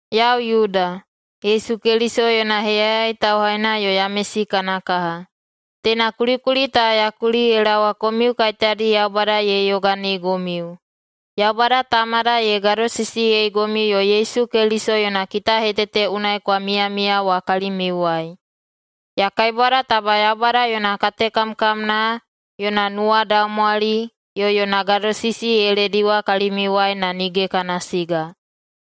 Yau Yuda, Yesu Keliso yona heyayai tauhaina yo Yamesi kana kaha. Teina kulikuli ta ya kuli ye laowa komiu kaiteyadi Yaubada ye yoganeigomiu, Yaubada Tamada ye gadosisiyeigomiu yo Yesu Keliso yona kitahetete unai kwa miyamiya wa kalimiuwai. Ya kaibwada taba Yaubada yona katekamkamna, yona nuwadaumwali, yo yona gadosisi ye lediwa kalimiuwai na nige kana siga.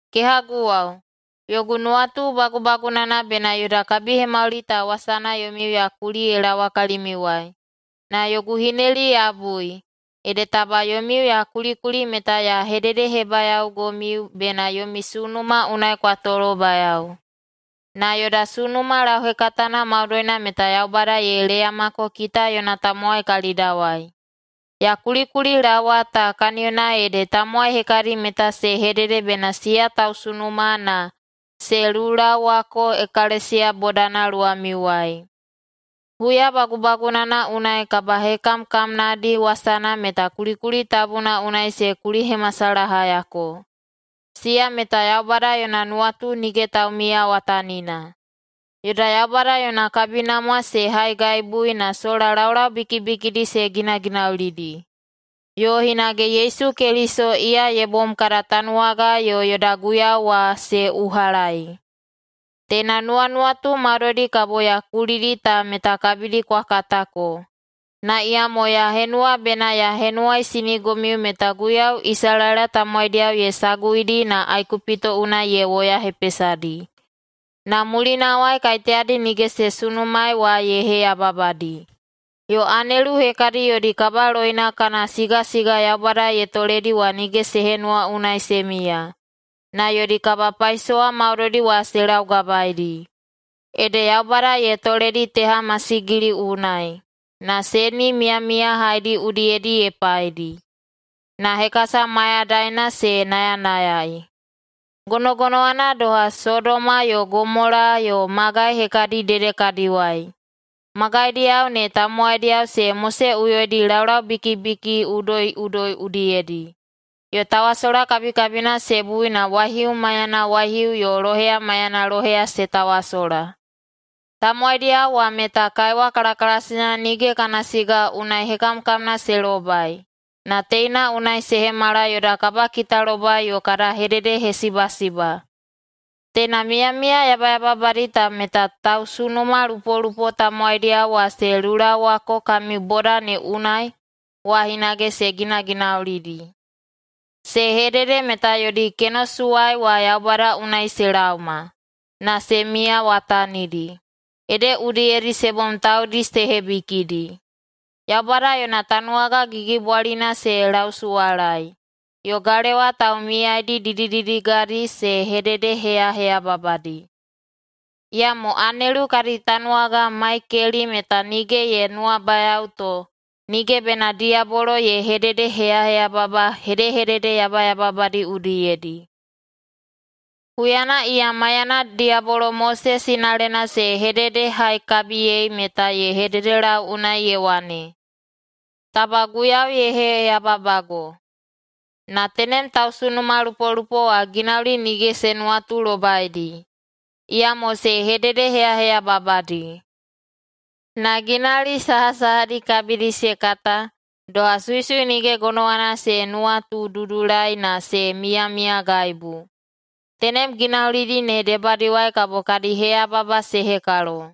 Kehaguwao, yogu nuwatu bagubagunana bena yoda kabihemauli ta wasana yomiu ya kuli ye laowa kalimiuwai. Na yogu hineli ya bui, ede taba yomiu ya kulikuli meta ya hededehebayaogomiu bena yomi sunuma unai kwa tolobayao. Na yoda sunuma lauhekatana maudoina meta Yaubada ye leyamako kita yona tamowai kalidawai. [Ya kulikulilaowa ta] kaniyona ede tamowai hekadi meta se hedede bena siya tausunuma na se lulaowako ekalesiya bodana luwamiuwai. Huya bagubagunana unai kabahekamkamnadi wasana meta kulikuli tabuna unai se kulihemasalahayako. Siya meta Yaubada yona nuwatu nige taumiyawatanina. Yoda Yaubada yona kabinamwa se haigaibui na sola laulau bikibikidi se ginaginaulidi. Yo hinage Yesu Keliso, iya ye bom kada Tanuwaga yo yoda Guiyau wa, se uhalaei. Teina nuwanuwatu maudoidi kabo ya kulidi ta meta kabidi kwa katako, na iyamo ya henuwa bena ya henuwaisinigomiu meta Guiyau Isalaela tamowaidiyao ye saguidi na Aikupito unai ye woyahepesadi, na mulinawai kaiteyadi nige se sunumaei wa ye heyababadi. Yo anelu hekadi yodi kabaloina kana sigasiga Yaubada ye toledi wa nige se henuwa unai se miya, na yodi kabapaisowa maudoidi wa se laugabaedi. Ede Yaubada ye toledi teha masigili unai, na seni miyamiyahaidi udiyedi ye paidi. Na hekasa mayadaina se nayanayai. Gonogonowana doha, Sodoma yo Gomola yo magai hekadi dedekadiwai, magaidiyao ne tamowaidiyao se moseꞌuyoidi laulaubikibiki udoiꞌudoi udiyedi, yo tawasola kabikabina se bui na waihiu maiyana waihiu yo loheya maiyana loheya se tawasola. Tamowaidiyao wa meta kaiwa kalakalasina nige kana siga unai hekamkamna se lobai, na teina unai se hemala yoda kabakitalobai yo kada hededehesibasiba. Teina miyamiya yabayababadi ta meta tausunumalupolupo tamowaidiyao wa se lulaowako kami boda ne unai wa hinage se ginaginaulidi. Se hedede meta yodi kenosuwai wa Yaubada unai se laoma, na se miyawatanidi, ede udiyedi se bom taudi se hebikidi, Yaubada yona tanuwaga gigibwalina se lausuwalaei, yo galewa taumiyaidi didididigadi se hededeheyaheyababadi. Iyamo anelu kadi tanuwaga Maikeli meta nige ye nuwabayao to nige bena diyabolo ye hededeheyaheyababa hedehedede yabayababadi udiyedi. Huyana iya maiyana diyabolo Mose sinalena se hededehaikabiyei meta ye hededelau unai ye wane, “Taba Guiyau ye heyababago!” Na tenem tausunumalupolupo wa ginauli nige se nuwatulobaidi, iyamo se hededeheyaheyababadi. Na ginauli sahasahadi kabidi se kata, doha suisui nige gonowana se nuwatududulai na se miyamiyagaibu, tenem ginaulidi ne debadiwai kabo kadi heyababa se hekalo.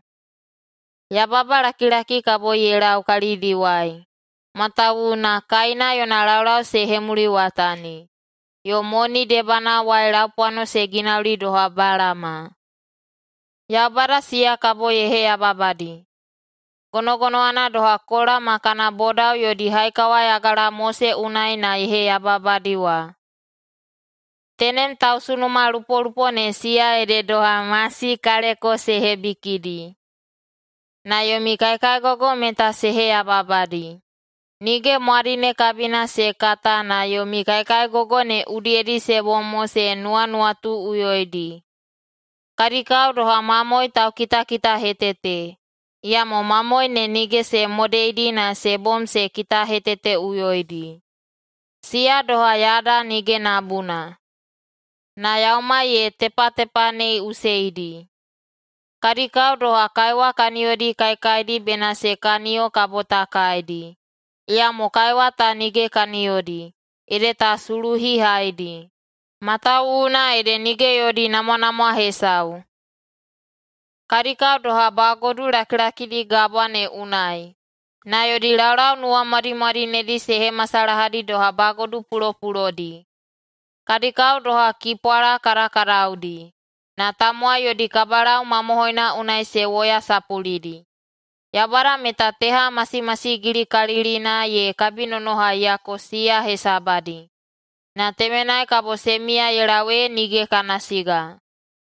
Yababalakilaki kabo ye lau kalidiwai. Matawuwuna Kaina yona laulau se hemuliwatani, yo moni debanawai laupwano se ginauli doha Balama. Yaubada siya kabo ye heyababadi, gonogonowana doha Kola ma kana bodao yodi haikawayagala Mose unai na ye heyababadi wa. Tenem tausunumalupolupo ne siya ede doha masi kaleko se hebikidi, na yomi kaikaigogo meta se heyababadi, nige mwadine kabina se kata na yomi kaikaigogo ne udiyedi se bom mo se nuwanuwatuꞌuyoidi. Kadi kao doha mamoe taukitakitahetete, iyamo mamoe ne nige se modeidi na se bom se kitaheteteꞌuyoidi. Siya doha yada nige nabuna, na yaumai ye tepatepaneiꞌuseidi. Kadi kao doha kaiwa kaniyodi kaikaidi bena se kaniyo kabo ta kaidi, iyamo kaiwa ta nige kaniyodi, ede ta suluhihaidi, matawuwuna ede nige yodi namwanamwa hesau. Kadi kao doha bagodu lakilakidi gabwa ne unai, na yodi laulau nuwamwadimwadinedi se hemasalahadi doha bagodu pulopulodi. Kadi kao doha kipwala kadakadaudi, na tamowai yodi kabalau mamohoina unai se woyasapulidi. Yaubada meta teha masimasigilikalilina ye kabinonohaiyako siya hesabadi, na temenai kabo se miya ye lau ee nige kana siga.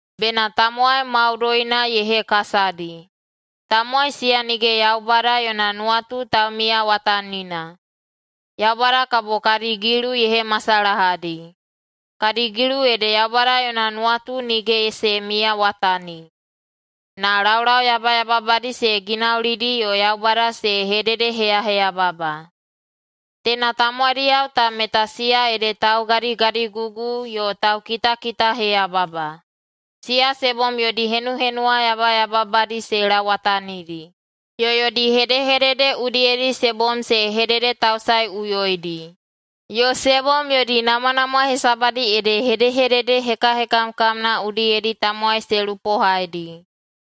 bena tamowai maudoina ye hekasadi. Tamowai siya nige Yaubada yona nuwatu taumiyawatanina, Yaubada kabo kadi gilu ye hemasalahadi. Kadi gilu ede Yaubada yona nuwatu nige se miyawatani, na laulau yabayababadi se ginaulidi yo Yaubada se hededeheyaheyababa.” Teina tamowaidiyao ta meta siya ede taugadigadigugu yo taukitakitaheyababa. Siya se bom yodi henuhenuwa yabayababadi se lauwatanidi, yo yodi hedehedede udiyedi se bom se hededetausaeꞌuyoidi, yo se bom yodi namwanamwa hesabadi ede hedehedede hekahekamna udiyedi tamowai se lupohaidi.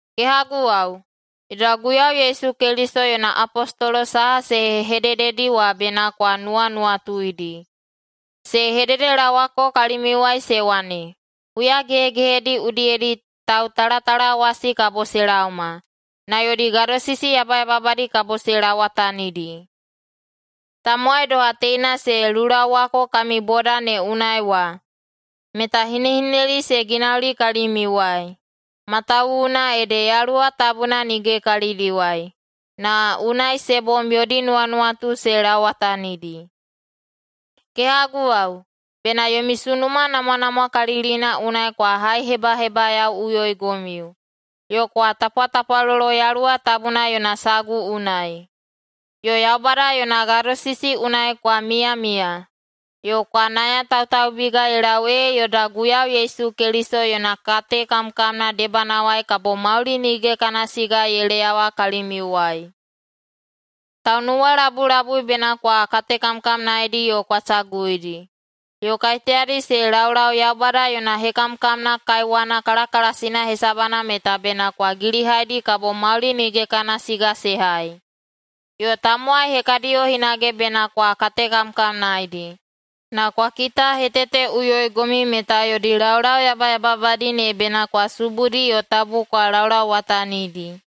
Kehaguwao, yoda Guiyau Yesu Keliso yona apostolo saha se hedededi wa bena kwa nuwanuwatuidi. Se hededelaowako kalimiuwai se wane, “Huya gehegehedi udiyedi tautalatalawasi kabo se laoma, na yodi gadosisi yabayababadi kabo se lauwatanidi.” Tamowai doha teina [se lulaowako kami boda ne unai wa] meta hinehineli se ginauli kalimiuwai, matawuwuna ede Yaluwa Tabuna nige kalidiwai, na unai se bom yodi nuwanuwatu se lauwatanidi. Kehaguwao, bena yomi sunuma namwanamwakalilina unai kwa haihebahebayaoꞌuyoigomiu, yo kwa tapwatapwalolo Yaluwa Tabuna yona sagu unai. Yo Yaubada yona gadosisi unai kwa miyamiya, yo kwa nayatautaubiga ye lau ee yoda Guiyau Yesu Keliso yona katekamkamna debanawai kabo mauli nige kana siga ye leyawa kalimiuwai. Taunuwalabulabui bena kwa katekamkamnaedi yo kwa saguidi. Yo kaiteyadi se laulau Yaubada yona hekamkamna kaiwana kalakalasina hesabana meta bena kwa gilihaidi kabo mauli nige kana siga se hai. Yo tamowai hekadiyo hinage bena kwa katekamkamnaedi, na kwa kitaheteteꞌuyoigomiu meta yodi laulau yabayababadi ne bena kwa subudi yo tabu kwa laulauwatanidi.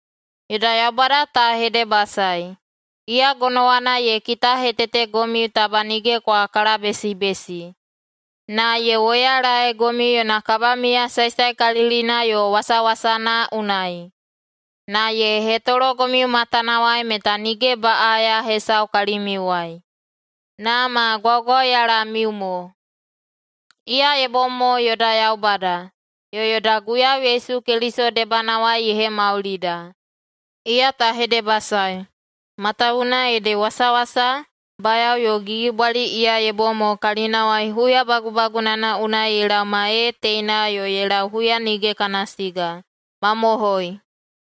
Yoda Yaubada ta hedebasaei. Iya gonowana ye kitahetetegomiu taba nige kwa kalabesibesi, na ye woyalaegomiu yona kabamiya saesaekalilina yo wasawasana unai, na ye hetologomiu matanawai meta nige baꞌaya hesau kalimiuwai, na ma gwaugwauyalamiu mo. Iya ye bom mo yoda Yaubada, yo yoda Guiyau Yesu Keliso debanawai ye hemaulida. Iya ta hedebasaei, matawuwuna ede wasawasa, bayao yo gigibwali iya ye bom mo kalinawai huya bagubagunana unai ye laoma ee teina yo ye lau huya nige kana siga! Mamohoi!